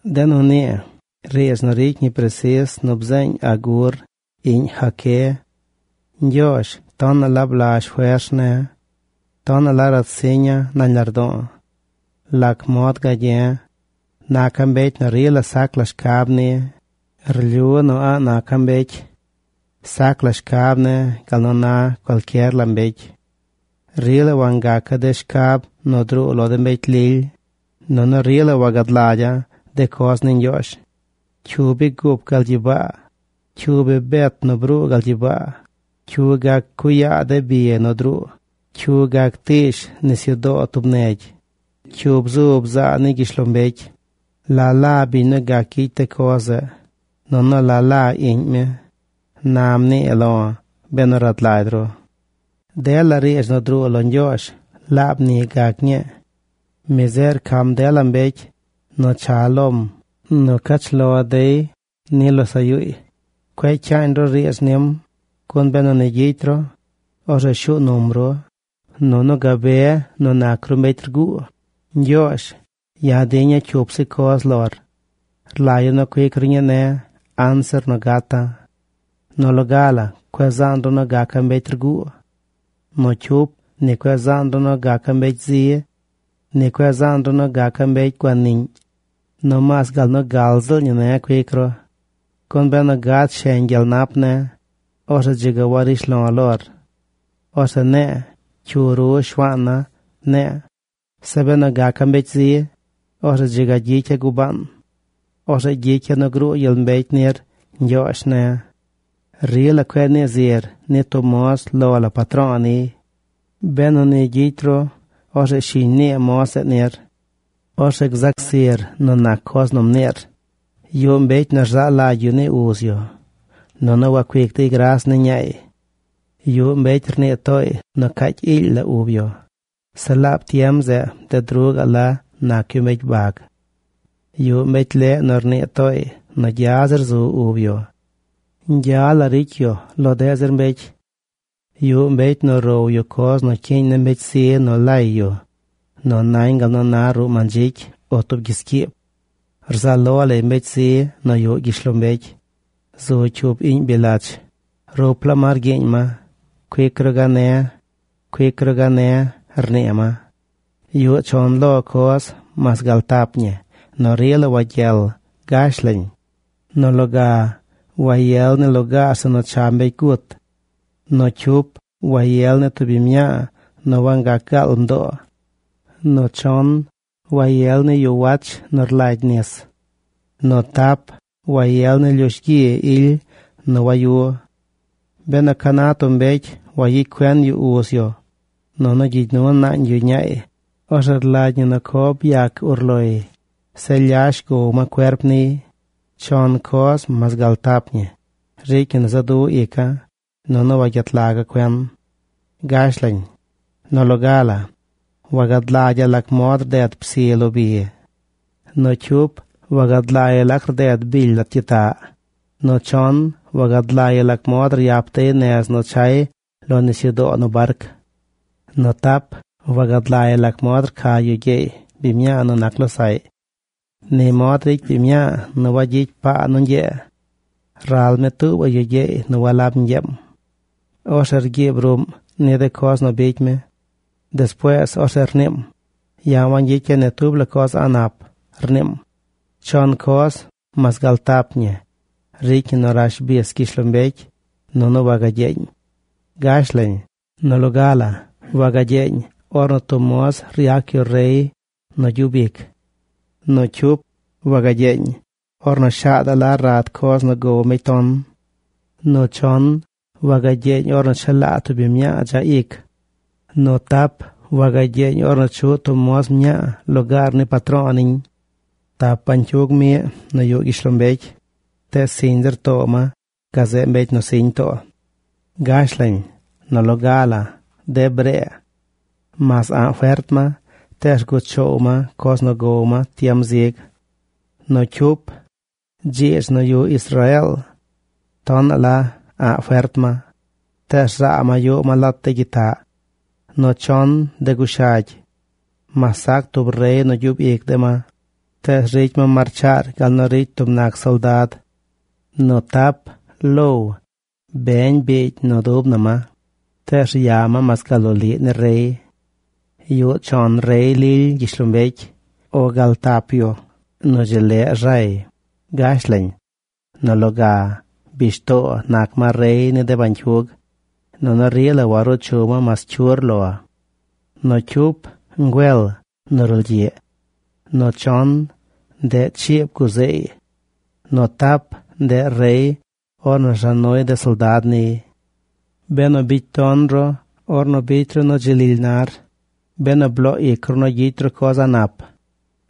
De nu nii riidz nu ricy ñi presis nu bzeeñ Agur, iꞌñ Jaqué. Ñgyoozh tonaꞌ la blazh fers ne̱. Tonaꞌ la ratsiña̱ nañ lardo̱o̱. ¿Lac mod gagye̱e̱? Naca̱ mbecy nu rila sac la shcab ni. Rlyu nu a̱ꞌ naca̱ mbecy. Sac la shcab ne̱ gal nu na cualcyer la mbecy. Rila wangaca̱ de shcab nu druu lo de mbecy lily, nunu rila wagad lagya̱ de coz ni Ñgyoozh. ¿Cyu bi gup gal gyibaa? ¿Cyu bi bet nu bruu gal gyibaa? ¿Cyu gac cuꞌ yaa de bi nu druu? ¿Cyu gac tiish nisyudoo tub negy? ¿Cyu bzu bzaa ni gyishlombecy? ¿La la biñ nu gac gyicy de coz zeꞌ, nunu la la iꞌñ mi? Na mnii lo̱ benu rad lagy ru. Dela riidz nu druu lo Ñgyoozh, laab ni gac ñii. Mi zeꞌ rcam dela mbecy nu cha lom nu cach lo dey lo losaꞌ yuuy. Cueꞌ cyaañ ru riidz nim, gun benu ni gyicy ru, orzeꞌ shuu num ru, nunu gabe nu nac ru mbecy rguu. Ñgyoozh, ya̱ diña̱ cyup zi coz lor. Rlagya̱ nu cuic ru ñii ne̱ anzir nu gata̱. Nu loga la cueꞌ zaan ru nu gaca̱ mbecy rguu. Nu cyup, ni cueꞌ zaan ru nu gaca̱ mbecy zi. Ni cueꞌ zaan ru nu gaca̱ mbecy guaniꞌñ. Nomaas gal nu gal ziꞌl ñi ne̱ cuic ru. Gun benu gad sheñ gyel nap ne̱, orzeꞌ dzi ga warishlo̱ lor. Orzeꞌ ne̱e̱: “¿Cyu ru Shuaan na?” ne̱e̱. Zeꞌ benu gaca̱ mbecy zi, orzeꞌ dzi ga gyicya̱ gubaan. Orzeꞌ gyicya̱ nu gruu gyel mbecy nir, Ñgyoozh ne̱. Rila cueꞌ nii zir ni tub moz lo la patro̱o̱ niy. Benu ni gyicy ru, orzeꞌ shiñ nii moz zeꞌ nir. Orzeꞌ gzac zir nu nac coz nu mniir. Yuꞌ mbecy nu rzaa lagy yu ni uz yu, nunu wacuic dey gras ni ñaay. Yuꞌ mbecy rnii tooy nu caacy iily la ub yu. Zeꞌ laab tiem zeꞌ bded ruꞌ gaꞌ la nac yu mbecy bag. Yuꞌ mbecy leꞌ nu rnii tooy nu gya zir zu ub yu. Ñgya la ricy yu lo deꞌ zir mbecy. Yuꞌ mbecy nu row yu coz nu cyiiñ ni mbecy zi nu lay yu nu nañ gal nu na ruꞌ mandzicy o tub gyiscyiib. Rzaꞌ lo lay mbecy zi nu yuꞌ gyishlombecy. Zu cyup iꞌñ bily lach. Rup laa ma rgyiiñ ma: “Cuic ru gane̱, cuic ru gane̱”, rnii ma. Yuꞌ chon lo coz, mas gal tap ñi, nu rila wagyel. Gash lañ: Nu loga, wayel ni lugaar zeꞌ nu cha mbecy gut. Nu cyup, wayel ni tub biñ mñaa nu wangac gaal mdoo. Nu chon, wayel ni yu wach nu rlagy nis. Nu tap, wayel ni lyush gyi ily nu wayu. Benu ca na tub mbecy wayicy cuen yu uz yu, nunu gyigy nu naañ yu ñaay, orzeꞌ rlagy ñi nu co byac urloy. Zeꞌ lyash gow ma cuerp niy. Chon coz, mas gal tap ñi, ricy ñi nu za du ica̱ nunu wagyet laga̱ cuen. Gash lañ: Nu loga la, wagad lagya̱ lac mod rded psi lo bi. Nu cyup, wagad lagya̱ lac rded bily lat gyitaꞌ. Nu chon, wagad lagya̱ lac mod ryap dey nez nu chay lo nisyudoo nu barc. Nu tap, wagad lagya̱ lac mod rca yu gyeey biñ mñaa nu nac losaꞌy. Ni mod ricy biñ mñaa nu wagyicy paa nu ñgyee. Ral mi tuubaꞌ yu gyeey nu walab ñgyeem. Orzeꞌ rgyiib ruꞌm ni de coz nu bicy mi. Despuees orzeꞌ rniim: “Ya̱ wangyicya̱ ni tub la coz a̱ꞌ nap”, rniim. Chon coz, mas gal tap ñi, ricy ñi nu rash bis gyishlombecy nunu wagagyeeñ. Gash lañ: Nu loga la, wagagyeeñ ornu tub moz ryac yu rey nu gyub ic. Nu cyup, wagagyeeñ ornu shaadaꞌ la rad coz nu gow mbecy ton. Nu chon, wagagyeeñ ornu chelaa tub biñ mñaa dzaꞌ ic. Nu tap, wagagyeeñ ornu chuꞌ tub moz mñaa lugaar ni patro̱o̱ niñ. Tap bañcyug miꞌ nu yuꞌ gyishlombecy, tees siñ zir too ma gazeꞌ mbecy nu siñ too. Gash lañ: Nu loga la, de bree. Mas a̱ꞌ fert ma, tees rguꞌ choow ma coz nu gow ma tiem zig. Nu cyup, dziidz nu yuꞌ Israeel. Tonaꞌ la a̱ꞌ fert ma, tees rzaa ma yuꞌ ma lat de gyitaꞌ. Nu chon, de gushagy. Mas sac tub rey nu gyub ic de ma, tees ricy ma marchaar gal nu ricy tub nac soldad. Nu tap, low. Beñ biigy nu dub na ma, tees rya mas gal loliꞌ ni rey. Yuꞌ chon rey lily gyishlombecy, o gal tap yu nu dzi leꞌ rzay. Gash lañ: Nu loga, bishtoo nac ma rey ni de bañcyug, nunu rila waruu chu ma mas cyur lo. Nu cyup, ngüel nu rulgyiꞌ. Nu chon, ndeꞌ chiib guzeey. Nu tap, ndeꞌ rey ornu rza nuy de soldad niy. Benu bicy ton ru ornu bicy ru nu dzi lily nar, benu bloo ic ru nu gyicy ru coz a̱ꞌ nap,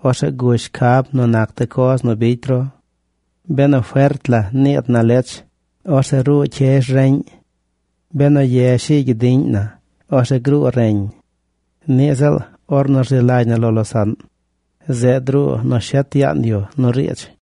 orzeꞌ gush shcab nu nac de coz nu bicy ru. Benu fert la niid na lech, orzeꞌ ruu cyezh reꞌñ. Benu ye shi̱i̱ gyidiꞌñ na, orzeꞌ gruu reñ. Niꞌ ziꞌl ornu rzi lagy na lo losaꞌn, zeꞌ druu nu shet yaan yu nu riidz.